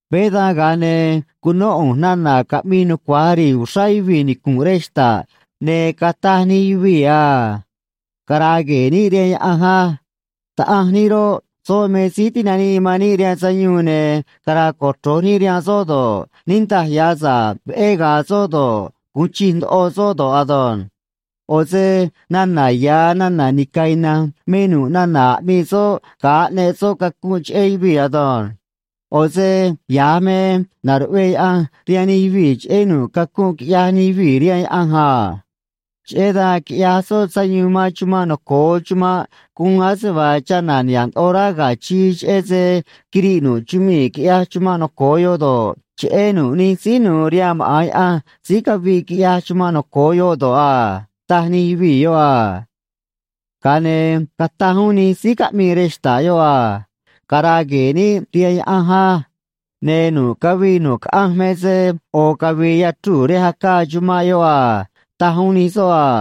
Veé dan, ga̱a ne̱ cunó ꞌu̱nj nana̱ caꞌmii nucua̱j ri̱i̱ uxrá yuvii̱ nicu̱nꞌ rej xta̱ꞌ, ne̱ cataj nij yuvii̱ a: Cara̱a̱ gue̱e̱ níꞌ rihaan Yaꞌanj á. Taꞌanj níꞌ roꞌ, soꞌ me síí tinanii man níꞌ rihaan sayuun, ne̱ cara̱a̱ cochro̱j níꞌ rihaan soꞌ do̱ꞌ, niꞌndaj ya̱ sa̱ꞌ veꞌé ga̱a̱ soꞌ do̱ꞌ, gu̱un chij ndoꞌo soꞌ do̱ꞌ ado̱nj. ꞌO̱ se nana̱ ya̱ nana̱ nica̱ ina̱nj me nu̱ꞌ nana̱ aꞌmii soꞌ ga̱a aꞌneꞌ soꞌ cacunꞌ cheꞌé yuvii̱ ado̱nj. ꞌO̱ se ya̱j me naruꞌvee Yaꞌanj rihaan nij yuvii̱ cheꞌé nu̱ꞌ cacunꞌ quiꞌyaj nij yuvii̱ rihaan Yaꞌanj a. Cheꞌé dan quiꞌyaj soꞌ sayuun man chumanꞌ noco̱o chumanꞌ guun ase vaa chana̱ niha̱ꞌ ndoꞌo rá ga̱ chii, cheꞌé se quiriꞌ nu̱ꞌ chumii̱, quiꞌyaj chumanꞌ noco̱o yoꞌ do̱ꞌ, cheꞌé nu̱ꞌ nij síí nu̱u̱ rihaan maꞌa̱n Yaꞌanj síí caviꞌ quiꞌyaj chumanꞌ noco̱o yoꞌ do̱ꞌ a, taj nij yuvii̱ yoꞌ a. Ga̱a ne̱ cataj uún nij síí caꞌmii rej xta̱ꞌ yoꞌ a: ―Cara̱a̱ gue̱e̱ níꞌ rihaan Yaꞌanj á. Ne̱ nu̱ꞌ cavii nu̱ꞌ caꞌanj me se ꞌo̱ cavi̱i̱ yachruu̱ rej acaa chumanꞌ yoꞌ a ―taj uún nij soꞌ a.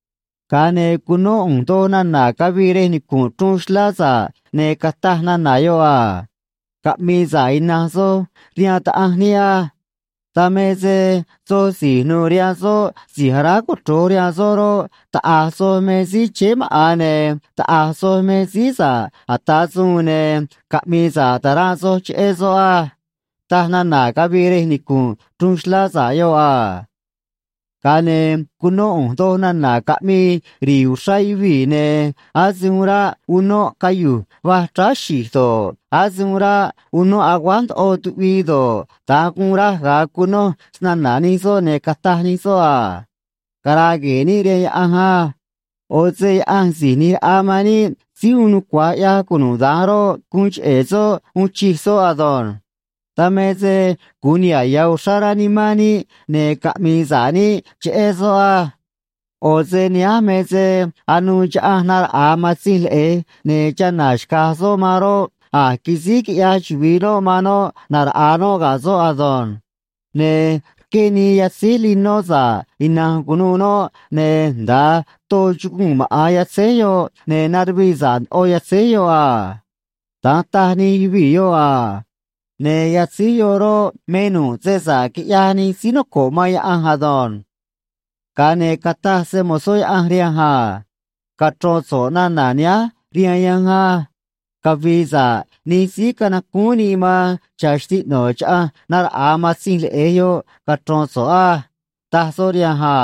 Ga̱a ne̱ cunó ꞌu̱nj doj nana̱ cavii rej nicu̱nꞌ chruun xlá sa̱ꞌ, ne̱ cataj nana̱ yoꞌ a: Caꞌmi̱i̱ sa̱ꞌ ina̱nj soj rihaan Taꞌanj níꞌ á. Dan me se soj si̱j nu̱u̱ rihaan soꞌ si̱j aráj cochro̱j rihaan soꞌ roꞌ, taꞌa̱j soj me síí chéé maꞌa̱n, ne̱ taꞌa̱j soj me síí sa̱ꞌ ata̱ suun, ne̱ caꞌmi̱i̱ sa̱ꞌ ta̱ranꞌ soj cheꞌé soꞌ á, taj nana̱ cavii rej nicu̱nꞌ chruun xlá sa̱ꞌ yoꞌ a. Ga̱a ne̱ cunó ꞌu̱nj doj nana̱ caꞌmii ri̱i̱ uxrá yuvii̱, ne̱ ase uun ráꞌ unóꞌ cayu̱j va̱j chráá xi̱j do̱ꞌ, ase uun ráꞌ unóꞌ aguáj ndoꞌo tuꞌvii do̱ꞌ, da̱nj guun raj ga̱a cunoj snana̱ nij soꞌ, ne̱ cataj nij soꞌ a: Cara̱a̱ gue̱e̱ níꞌ rihaan Yaꞌanj á. ꞌO̱ se Yaꞌanj Si̱j ꞌNi̱j Raꞌa man níꞌ Síí Uun Nucua̱j ꞌYaj Cunuda̱nj roꞌ, guun cheꞌe̱ soꞌ uun chij soꞌ ado̱nj. Dan me se gu̱un niha̱ꞌ ya̱ uxrá rá nimán níꞌ, ne̱ caꞌmi̱i̱ sa̱ꞌ níꞌ cheꞌé soꞌ á. ꞌO̱ se nihánj me se anuû chaꞌanj naraꞌa̱a Matzinj Leꞌe̱j, ne̱ chana̱ xca̱j soꞌ man roꞌ, a̱j quisíj quiꞌyaj chuvi̱i noꞌ man noꞌ na̱raꞌa̱a noꞌ ga̱ soꞌ ado̱nj. Ne̱ rqué nii yatzíj linó sa̱ꞌ ina̱nj cu̱nuû noꞌ, ne̱ nda̱a too chuguu̱n maꞌa̱n yatzéj yoꞌ, ne̱ naruvii sa̱ꞌ ndoꞌo yatzéj yoꞌ a. Da̱nj taj nij yuvii̱ yoꞌ a. Ne̱ yatzéj yoꞌ roꞌ, me nu̱ꞌ se sa̱ꞌ quiꞌyaj nij síí noco̱ꞌ man Yaꞌanj ado̱nj. Ga̱a ne̱ cataj se‑mo̱zó Yaꞌanj rihanj a: ―Cachro̱n so̱ꞌ nana̱ nihánj rihaan yanj á: “Cavi̱i̱ sa̱ꞌ nij síí canacúún nii man cha̱ xtiꞌno̱ chaꞌanj na̱raꞌa̱a Matzinj Leꞌe̱j yoꞌ”, cachro̱n so̱ꞌ á ―taj soꞌ rihanj a.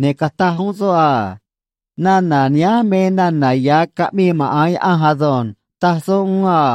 Ne̱ cataj uún soꞌ a: ―Nana̱ nihánj me nana̱ ya̱ caꞌmii maꞌa̱n Yaꞌanj ado̱nj ―taj soꞌ uún a.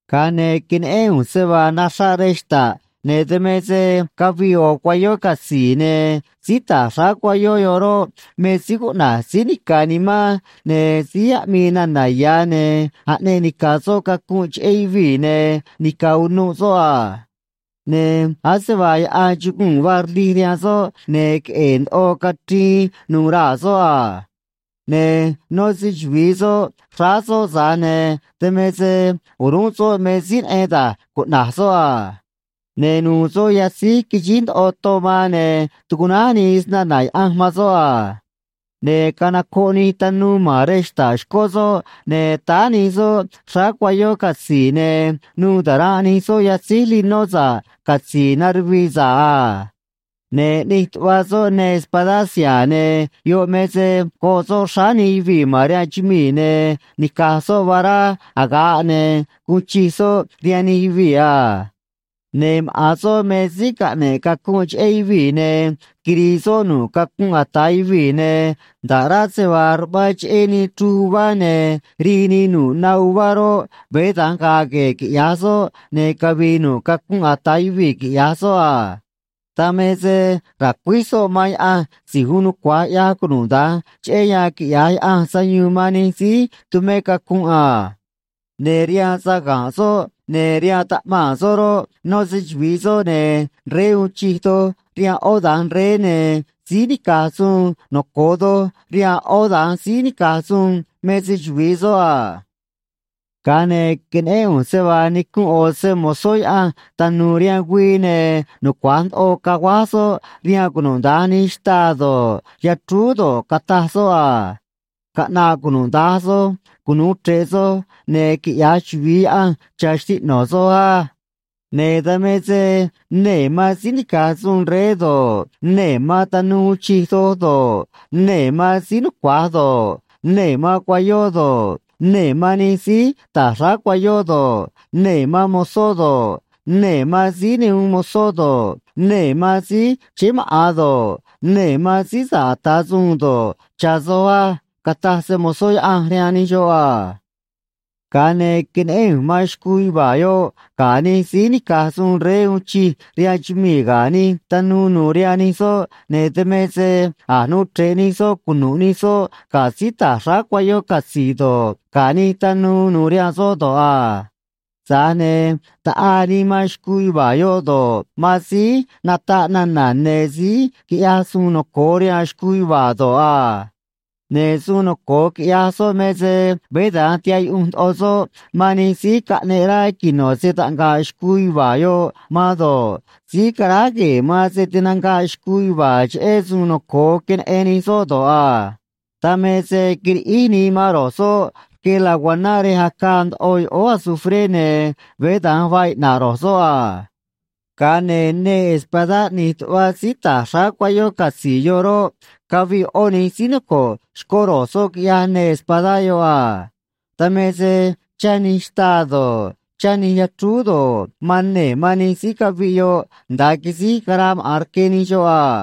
Ga̱a ne̱ queneꞌén ꞌu̱nj se vaa naxraꞌ rej xta̱ꞌ, ne̱ dan me se cavii ꞌo̱ cuayó catzi̱i̱, ne̱ síí ta̱j xráá cuayó yoꞌ roꞌ, me síí cuꞌna̱j Síí Nica̱ Nimán ne̱ Síí Aꞌmii Nana̱ Ya̱, ne̱ aꞌneꞌ nica̱ soꞌ cacunꞌ cheꞌé yuvii̱, ne̱ nica̱ unuꞌ soꞌ a. Ne̱ ase vaa yaꞌan chuguu̱n vaa rlij rihaan soꞌ, ne̱ queꞌe̱e̱ ndoꞌo cachriin nuû raa̱ soꞌ a. Ne̱ nó se‑chuvi̱i soꞌ xráá soꞌ, tza̱j ne̱ dan me se o̱rúnꞌ soꞌ me síí neꞌen da̱j cuꞌna̱j soꞌ a. Ne̱ nu̱u̱ soꞌ yatzíj quixíj ndoꞌo ton man, ne̱ tucuꞌnáj nii Snana̱ Yaꞌanj man soꞌ a. Ne̱ canocoꞌ nij tanuu ma̱n rej xta̱ꞌ xcó soꞌ, ne̱ táá nij soꞌ xráá cuayó catzi̱i̱, ne̱ nu̱u̱ ta̱ranꞌ nij soꞌ yatzíj linó sa̱ꞌ catzi̱i̱ naruvii sa̱ꞌ a. Ne̱ ꞌni̱j tuꞌva soꞌ neê espadá siha̱a̱, ne̱ yoꞌ me se go̱ꞌ soꞌ xráá nij yuvii̱ ma̱n rihaan chumii̱, ne̱ nica̱j soꞌ vará aga̱ꞌ, ne̱ gu̱un chij soꞌ rihaan nij yuvii̱ a. Ne̱ maꞌa̱n soꞌ me síí caꞌne̱ꞌ cacunꞌ cheꞌé yuvii̱, ne̱ quiri̱i̱ soꞌ nu̱ꞌ cacunꞌ ata̱ yuvii̱, ne̱ nda̱ꞌ rá se vaa ruꞌmaan cheꞌé nii chruj uvá ne̱ rii nii nu̱ꞌ na uvá roꞌ, veé da̱nj ga̱a̱ gue̱e̱ quiꞌya̱j soꞌ, ne̱ cavi̱i̱ nu̱ꞌ cacunꞌ ata̱ yuvii̱, quiꞌya̱j soꞌ a. Dan me se racuíj soꞌ man Yaꞌanj Si̱j Uun Nucua̱j ꞌYaj Cunuda̱nj cheꞌé yan quiꞌya̱j Yaꞌanj sayuun man nij síí tumé cacunꞌ a. Ne̱ rihaan saga̱nꞌ soꞌ ne̱ rihaan taꞌmaa̱n soꞌ roꞌ, nó se‑chuvi̱i soꞌ, ne̱ “Rey uun chij doj rihaan ꞌó da̱nj rey, ne̱ Síí nica̱j suun noco̱o doj rihaan ꞌó da̱nj síí nica̱j suun”, me se‑chuvi̱i soꞌ a. Ga̱a ne̱ queneꞌén ꞌu̱nj se vaa nicunꞌ ꞌo̱ se‑mo̱zó Yaꞌanj tanu̱u̱ rihaan güii, ne̱ nucua̱j ndoꞌo caguáj soꞌ rihaan cunuda̱nj nij xtaa do̱ꞌ, yachrúú do̱ꞌ, cataj soꞌ a: ―Caꞌna̱ꞌ cunuda̱nj soj cunu̱u chre̱ꞌ soj, ne̱ quiꞌya̱j chuvi̱i Yaꞌanj cha̱ xtiꞌno̱ soj á. Ne̱ dan me se nee̱ man síí nica̱j suun rey do̱ꞌ, nee̱ man tanuu uun chij doj do̱ꞌ, nee̱ man síí nucua̱j do̱ꞌ, nee̱ man cuayó do̱ꞌ, nee̱ man nij síí ta̱j xráá cuayó do̱ꞌ, nee̱ man mozó do̱ꞌ, nee̱ man síí ne uun mozó do̱ꞌ, nee̱ man síí chéé maꞌa̱n do̱ꞌ, nee̱ man síí sa̱ꞌ ata̱ suun do̱ꞌ, cha̱ soj á ―cataj se‑mo̱zó Yaꞌanj rihaan nij xoꞌ a. Ga̱a ne̱ queneꞌén ꞌu̱nj man xcuu yuva̱a̱ yoꞌ ga̱ nij síí nica̱j suun rey uun chij rihaan chumii̱ ga̱ nij tanuu nu̱u̱ rihaan nij soꞌ, ne̱ dan me se a̱j nuu chre̱ꞌ nij soꞌ cunu̱ꞌ nij soꞌ ga̱ síí ta̱j xráá cuayó catzi̱i̱ do̱ꞌ, ga̱ nij tanuu nu̱u̱ rihaan soꞌ do̱ꞌ a. Tza̱j ne̱ taꞌaa nii man xcuu yuva̱a̱ yoꞌ do̱ꞌ, man síí nataꞌ nana̱ ne̱ síí quiꞌyaj suun noco̱o rihaan xcuu yuva̱a̱ do̱ꞌ a. Ne̱ suun noco̱o quiꞌyaj soꞌ me se veé da̱nj tihaꞌ yuꞌunj ndoꞌo soꞌ man nij síí caꞌneꞌ rá quino̱ se‑taꞌnga̱ꞌ xcuu yuva̱a̱ yoꞌ man do̱ꞌ, síí caráj gue̱e̱ man se tinanga̱ꞌ xcuu yuva̱a̱ cheꞌé suun noco̱o queneꞌen nij soꞌ do̱ꞌ a. Dan me se quiriꞌíj nii man ro̱j soꞌ rque laguaná rej acaa ndoꞌo yoꞌóó azufré, ne̱ veé da̱nj vaa iꞌna̱ꞌ ro̱j soꞌ a. Ga̱a ne̱ neê espadá ꞌni̱j tuꞌva síí ta̱j xráá cuayó catzi̱i̱ yoꞌ roꞌ, caviꞌ ꞌó nij síí noco̱ꞌ xcó ro̱j soꞌ, quiꞌyaj neê espadá yoꞌ a. Dan me se chá nij xtaa do̱ꞌ, chá nij yachrúú do̱ꞌ, man nee̱ man nij síí caviꞌ yoꞌ nda̱a quisíj caraa maꞌa̱n rque nij xoꞌ a.